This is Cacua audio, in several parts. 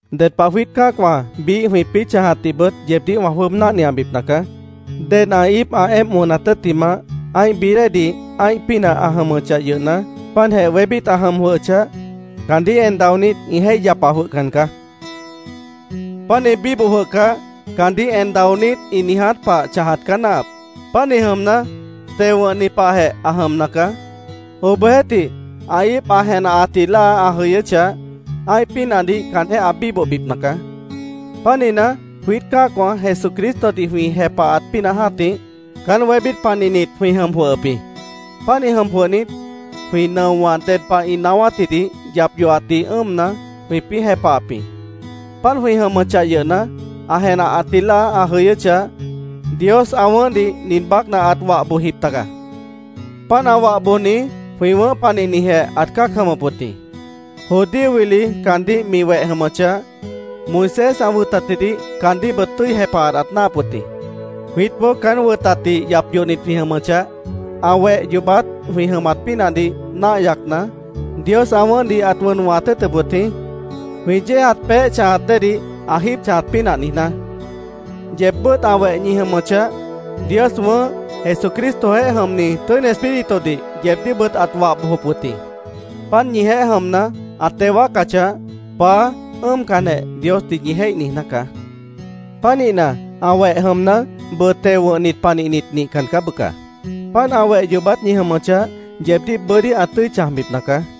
Ded pah jwiít cã́acwã biíh jwĩpĩ́ chãjatdihbʉt yeebdíh wã jwʉ́ʉb náhniabipna caá. Ded ã íip ã éemp wʉnat tʉ́ttimah, ã́ih bií déedih ã́ih pínah ã jʉmʉchah yʉhna, páantjeh wébít ã jʉm jwʉhʉchah, caandíh en daonít ĩ jéih yapa jwʉhcan caá. Pánih bíboh jwʉhcah, caandíh en daonít ĩ niiját pah chãjat caá náahap. Pánih jʉmna, teo wʉ̃hni pahjeh ã jʉmna caá. Obohjeéhtih, ã íip ã jenahatji láa ã jʉyʉ́chah, ã́ih pínahdih caanjéh ã bíbohbipna caá. Pánihna, jwiít cã́acwã Jesucristodih jwĩ jepahat pínah jã́tih, caán wébít panihnit jwĩ jʉm jwʉhʉp jĩ. Pánih jʉm jwʉhnit, jwĩ nʉowã ded pah ĩ naáwátjidih yap yohatdih ʉ́ʉmna, jwĩpĩ́ jepahap jĩ. Páant jwĩ jʉmʉchah yʉhna, ã jenahatji láa ã jʉyʉ́chah, Dios ã wʉ̃ʉ́hdih nin baácna ãt wah bojjip taga. Páant ã wah bojni jwĩ wʉ̃ʉ́h panihnijeh ãt cã́ac jʉmʉp wʉt jĩ. Judío wili caandíh mi weh jʉmʉchah, Moisés ã wʉtatjidih caandíhbʉt tʉ́i jepahat ãt náahap wʉt jĩ. Jwiítboó caán wʉtatdih yap yohnit jwĩ jʉmʉchah, ã weh yoobát jwĩ jʉmat pínahdih náah yacna, Dios ã wʉ̃ʉ́hdih ãt wʉn wʉ̃hat tʉ́ʉtʉp wʉt jĩ, jwĩ yéejat peéh chãjat déedih ã jíib chãjat pínah niijná. Yeebbʉ́t ã weh ñi jʉmʉchah, Dios wʉ̃ʉ́h Jesucristojeéh jʉmni Tʉ́ini Espíritudih yeebdíhbʉt ãt wah bojop wʉt jĩ. Páant ñijeéh jʉmna, ã teo wáacachah, “Paá”, ʉ́ʉmcanjeh Diosdih ñi jéih niijná caá. Pánihna, ã weh jʉmna, bʉʉ teo wʉ̃hnit panihnit nihcan caá, bʉca. Páant ã weh yoobát ñi jʉmʉchah, yeebdíh bʉ́dí ã tʉ́i chãjbipna caá.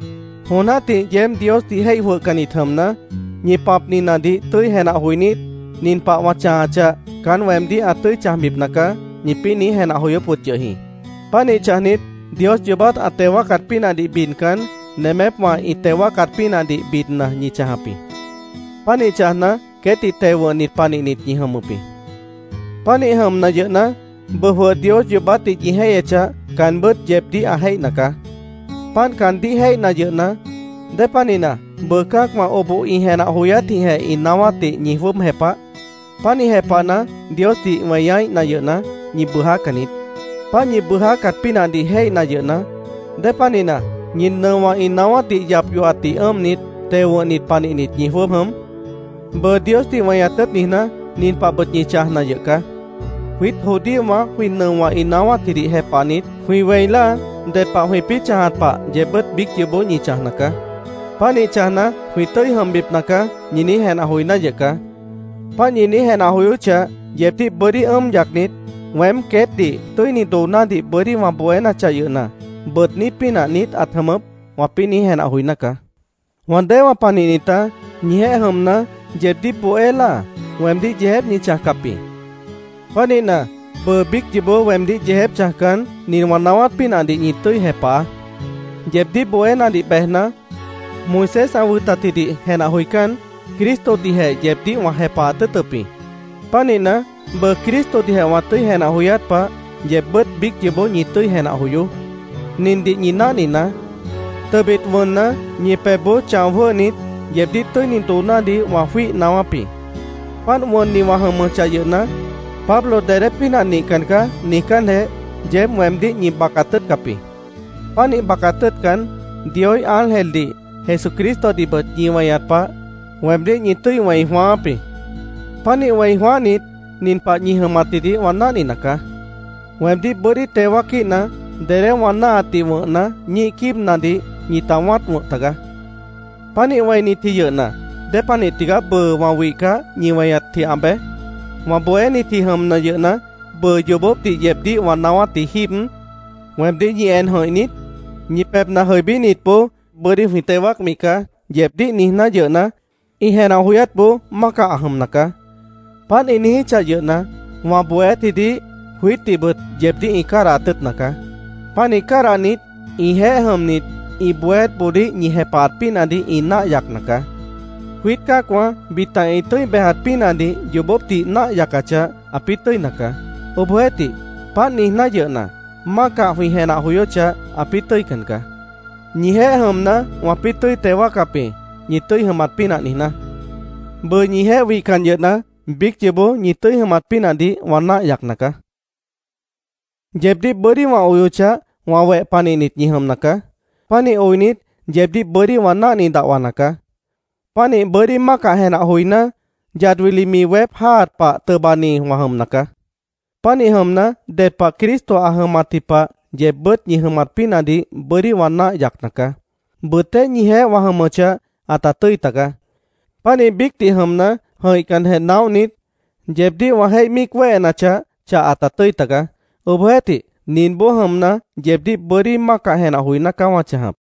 Jon jã́tih yeéb Diosdih jéih jwʉhcannit jʉmna, ñi pãpninadih tʉ́i jenah joinít, “Nin pah wã chãjachah, caán weemdíh ã tʉ́i chãjbipna caá”, ñipĩ́ niíj jenah joyóp yʉh jĩ. Pánih chãjnit, Dios yoobát ã teo wáacat pínahdih bidcan, nemépwã ĩ teo wáacat pínahdih bidna ñi chãjap jĩ. Pánih chãjna, queétdih teo wʉ̃hnit panihnit ñi jʉmʉp jĩ. Pánih jʉmna yʉhna, bʉʉ jwʉh Dios yoobátdih ñi jéihyechah, caanbʉ́t yeebdíh ã jéihna caá. Páant caandíh jéihna yʉhna, ¿Dépanihna bʉʉ cã́acwã oboh ĩ jenah joyátjĩhjeh ĩ naáwátdih ñi jwʉ́ʉb jepah? Pánih jepahna, Diosdih weñaíhna yʉhna, ñi bʉjácan niít. Páant ñi bʉʉjácat pínahdih jéihna yʉhna, ¿Dépanihna ñi nʉowã ĩ naáwátdih yap yohatdih ʉ́ʉmnit, teo wʉ̃hnit panihnit ñi jwʉ́ʉb jʉm? Bʉʉ Diosdih weñat tʉ́ʉt niijná, nin pahbʉt ñi chãjna yʉh caá: Jwiít judíowã jwĩ nʉowã ĩ naáwátjidih jepahnit, jwĩ wẽi láa ded pah jwĩpĩ́ chãjat pah yeebbʉ́t biíc yoobó ñi chãjna caá. “Pánih chãjna, jwĩ tʉ́i jʉmbipna caá”, ñi niíj jenah joiná yʉh caá. Páant ñi niíj jenah joyóchah, yeebdíh bʉ́dí ʉ́ʉm yacnit, “Weém queétdih tʉ́ini doonádih bʉ́dí wã bohénachah yʉhna, ¿bʉʉdní pínah niít ãt jʉmʉp?” wãpĩ́ niíj jenah joiná caá. Wã déewã panihnitá, ñijeéh jʉmna, yeebdíh bohé láa, weemdíh yeejép ñi chãjcap jĩ. Pánihna, bʉʉ biíc yoobó weemdíh yeejép chãjcan, nin wã naáwát pínahdih ñi tʉ́i jepahaá: Yeebdíh bohénadih bejna, Moisés ã wʉtatjidih jenah joicán, Cristodihjeh yeebdíh wã jepahat tʉ́ʉtʉp jĩ. Pánihna, bʉʉ Cristodihjeh wã tʉ́i jenah joyát pah, yeebbʉ́t biíc yoobó ñi tʉ́i jenah joyoó. Nindih ñi náhninaá: Tʉbit wʉnna, ñi pebhboó chão jwʉ́hnit, yeebdíh tʉ́ini doonádih wã jwíih naáwáp jĩ. Páant wʉnni wã jʉmʉchah yʉhna, “Pablo dedé pínah nihcan caá”, niijcánjeh, yeéb weemdíh ñi bacat tʉ́ʉtcap jĩ. Pánih bacat tʉ́ʉtcan, Dioíh ángeldih, Jesucristodihbʉt ñi weñat pah, weemdíh ñi tʉ́i wẽi jwãááp jĩ. Pánih wẽi jwãáhnit, nin pah ñi jʉmatjidih wã náhnina caá: Weemdíh bʉ́dí teo wáaquíhna, dedé wã náahatdih wʉ̃hna, ñíih quíibnadih ñita wã́at wʉ̃h tagaá. Pánih wẽinitji yʉhna, ¿dépanih tigaá bʉʉ wã wihcah, ñi weñatji ã bej? Wã bohénitji jʉmna yʉhna, ¿bʉʉ yoobópdih yeebdíh wã naáwátji jíib, weemdíh ñi en jʉ̃ih niít? Ñi pebhna jʉibínitboó “Bʉ́dí jwĩ teo wáacmi caá”, yeebdíh niijná yʉhna, ĩ jenah joyátboó mácah ã jʉmna caá. Páant ĩ niijíchah yʉhna, wã bohéátjidih, jwiítdihbʉt yeebdíh ĩ cádahat tʉ́ʉtna caá. Pánih cádahnit, ĩjeéh jʉmnit, ĩ bohéátboodíh ñi jepahat pínahdih ĩ náah yacna caá. Jwiít cã́acwã bita ĩ tʉ́i bejat pínahdih yoobópdih náah yacachah, ãpĩ́ tʉ́ina caá. Obohjeéhtih, páant niijná yʉhna, mácah jwĩ jenah joyóchah, ãpĩ́ tʉ́ican caá. Ñijeéh jʉmna, wãpĩ́ tʉ́i teo wáacap jĩ, ñi tʉ́i jʉmat pínah niijná. Bʉʉ ñijeéh wihcan yʉhna, biíc yoobó ñi tʉ́i jʉmat pínahdih wã náah yacna caá. Yeebdíh bʉ́dí wã oyochah, wã weh panihnit ñi jʉmna caá. Pánih oinit, yeebdíh bʉ́dí wã náhni dahwana caá. Pánih bʉ́dí mácah jenah joiná, yad wili mi weép jáaat pah tʉbani wã jʉmna caá. Pánih jʉmna, ded pah Cristo ã jʉmatji pah yeebbʉ́t ñi jʉmat pínahdih bʉ́dí wã náah yacna caá. Bʉtéh ñijeéh wã jʉmʉchah, ãta tʉ́i tagaá. Pánih biícdih jʉmna, jʉ̃ihcanjeh naóhnit, yeebdíh wã jéih míic wéhenachah, chah ãta tʉ́i tagaá. Obohjeéhtih, ninboó jʉmna, yeebdíh bʉ́dí mácah jenah joiná caá wã chãjap.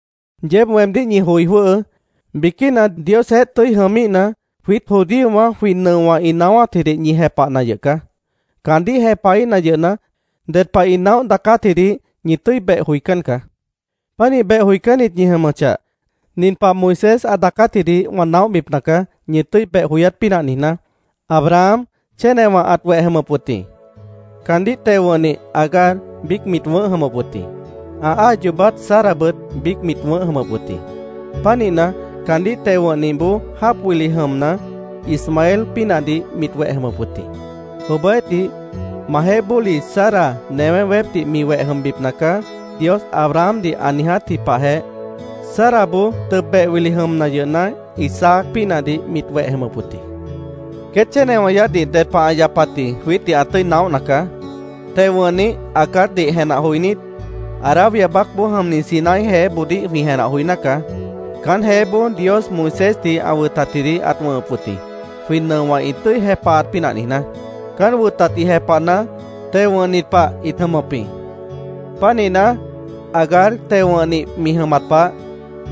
Yeéb weemdíh ñi joi jwʉ́hʉʉ́. Biquína Diosjeéh tʉ́i jʉmíhna, jwiít judíowã jwĩ nʉowã ĩ naáwátjidih ñi jepahna yʉh caá. Caandíh jepahíhna yʉhna, ded pah ĩ naóh daacátjidih ñi tʉ́i beh joicán caá. Pánih beh joicánnit ñi jʉmʉchah, nin pah Moisés ã daacátjidih wã naóhbipna caá, ñi tʉ́i beh joyát pínah niijná: Abraham chénewã ãt weh jʉmʉp wʉt jĩ. Caandíh teo wʉ̃hnih Agar biíc mit wʉ̃ʉ́h jʉmʉp wʉt jĩ. Ã áa yoobát Sarabʉt biíc mit wʉ̃ʉ́h jʉmʉp wʉt jĩ. Pánihna, caandíh teo wʉ̃hnihboó, jáap wili jʉmna, Ismael pínahdih mit weh jʉmʉp wʉt jĩ. Obohjeéhtih, “Majeéh bóli, Sara newé weépdih mi weh jʉmbipna caá”, Dios Abrahamdih ã niijátji pahjeh, Saraboó tʉb beh wili jʉmna yʉhna, Isaac pínahdih mit weh jʉmʉp wʉt jĩ. Queét chénewã yaádhdih ded pah ã yapatji jwiítdih ã tʉ́i naóhna caá. Teo wʉ̃hnih Agardih jenah joinít, Arabia baácboó jʉmni Sinaí jeéboodíh jwĩ jenah joiná caá. Caán jeéboó Dios Moisésdih ã wʉtatjidih ãt wʉ̃hʉp wʉt jĩ, jwĩ nʉowã ĩ tʉ́i jepahat pínah niijná. Caán wʉtatdih jepahna, teo wʉ̃hnit pah ĩt jʉmʉp jĩ. Pánihna, Agar teo wʉ̃hnih mi jʉmat pah,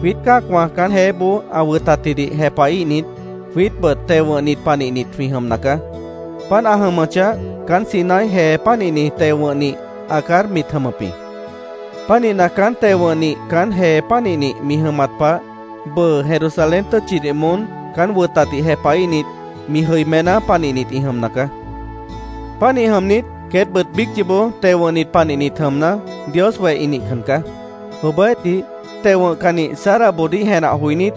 jwiít cã́acwã caán jeéboó ã wʉtatjidih jepahíhnit, jwiítbʉt teo wʉ̃hnit panihnit jwĩ jʉmna caá. Páant ã jʉmʉchah, caán Sinaí jee pánihni teo wʉ̃hnih Agar mit jʉmʉp jĩ. Pánihna, caánt teo wʉ̃hnih caán jee pánihnih mi jʉmat pah, bʉʉ Jerusalén tʉ́tchidih moón caán wʉtatdih jepahíhnit, mi jʉimená panihnit ĩ jʉmna caá. Pánih jʉmnit, queétbʉt biíc yoobó teo wʉ̃hnit panihnit jʉmna, Dios weh ĩ nihcan caá. Obohjeéhtih, teo wʉ̃hcannih Saraboodíh jenah joinít,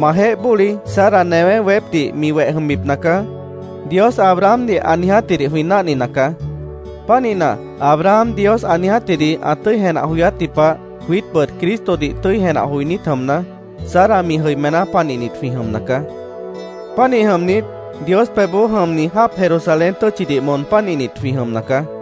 “Majeéh bóli Sara newé weépdih mi weh jʉmbipna caá”, Dios Abrahamdih ã niijátjidih jwĩ náhnina caá. Pánihna, Abraham Dios ã niijátjidih ã tʉ́i jenah joyátji pah, jwiítbʉt Cristodih tʉ́i jenah joinít jʉmna, Sara mi jʉimená panihnit jwĩ jʉmna caá. Pánih jʉmnit, Dios pebhboó jʉmni jáap Jerusalén tʉ́tchidih moon pánihnit jwĩ jʉmna caá.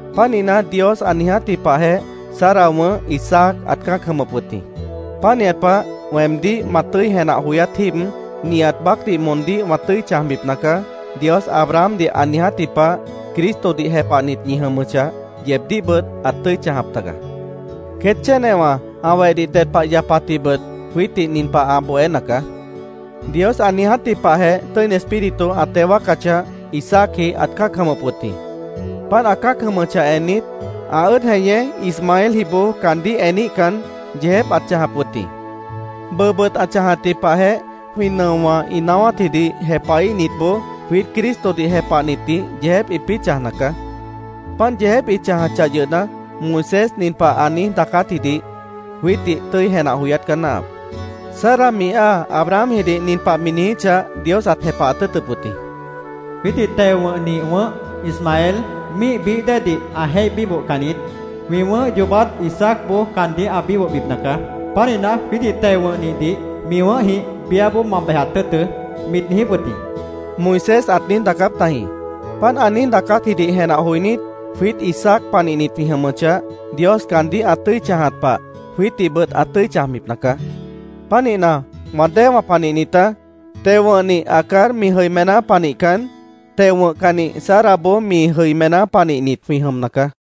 Pánihna, Dios ã niijátji pahjeh Sara wʉ̃ʉ́h Isaac ãt cã́ac jʉmʉp wʉt jĩ. Pánihat pah, “Weemdíh ma tʉ́i jenah joyát jíib, nihat baácdih moondíh wã tʉ́i chãjbipna caá”, Dios Abrahamdih ã niijátji pah, Cristodih jepahnit ñi jʉmʉchah, yeebdíhbʉt ãt tʉ́i chãjap taga. Queét chénewã ã wehdih ded pah ã yapatjibʉt jwiítdih nin pah ã bohéna caá: Dios ã niijátji pahjeh Tʉ́ini Espíritu ã teo wáacachah, Isaacji ãt cã́ac jʉmʉp wʉt jĩ. Páant ã cã́ac jʉmʉchah ennit, ã ʉ́ʉd jeñé Ismaeljiboó caandíh eníhcan, yeejép ãt chãjap wʉt jĩ. Bʉʉbʉt ã chãjatji pahjeh jwĩ nʉowã ĩ naáwátjidih jepahíhnitboó jwiít Cristodih jepahnitdih yeejép ĩpĩ́ chãjna caá. Páant yeejép ĩ chãjachah yʉhna, Moisés nin pah ã niíj daacátjidih jwiítdih tʉ́i jenah joyát caá náahap: “Sara mi áa Abrahamjidih nin pah mi niijíchah, Dios ãt jepahat tʉ́ʉtʉp wʉt jĩ: ‘Jwiítdih teo wʉ̃hnih wʉ̃ʉ́h, Ismael, míih bií déedih ã jéih bíbohcan niít. Jwĩ wʉ̃ʉ́h yoobát Isaacboó caandíh ã bíbohbipna caá. Pánihna, jwiítdih teo wʉ̃hnihdih mi wʉ̃ʉ́hjĩh biáboó ma bejat tʉ́ʉtʉ́’, mit niijíp wʉt jĩ”, Moisés ãt niíj daacáp tajĩ. Páant ã niíj daacátjidih jenah joinít, jwiít Isaac panihnit jwĩ jʉmʉchah, Dios caandíh ã tʉ́i chãjat pah, jwiítdihbʉt ã tʉ́i chãjbipna caá. Pánihna, wã déewã panihnitá, teo wʉ̃hnih Agar mi jʉimená panihcan, teo wʉ̃hcannih Saraboó mi jʉimená panihnit jwĩ jʉmna caá.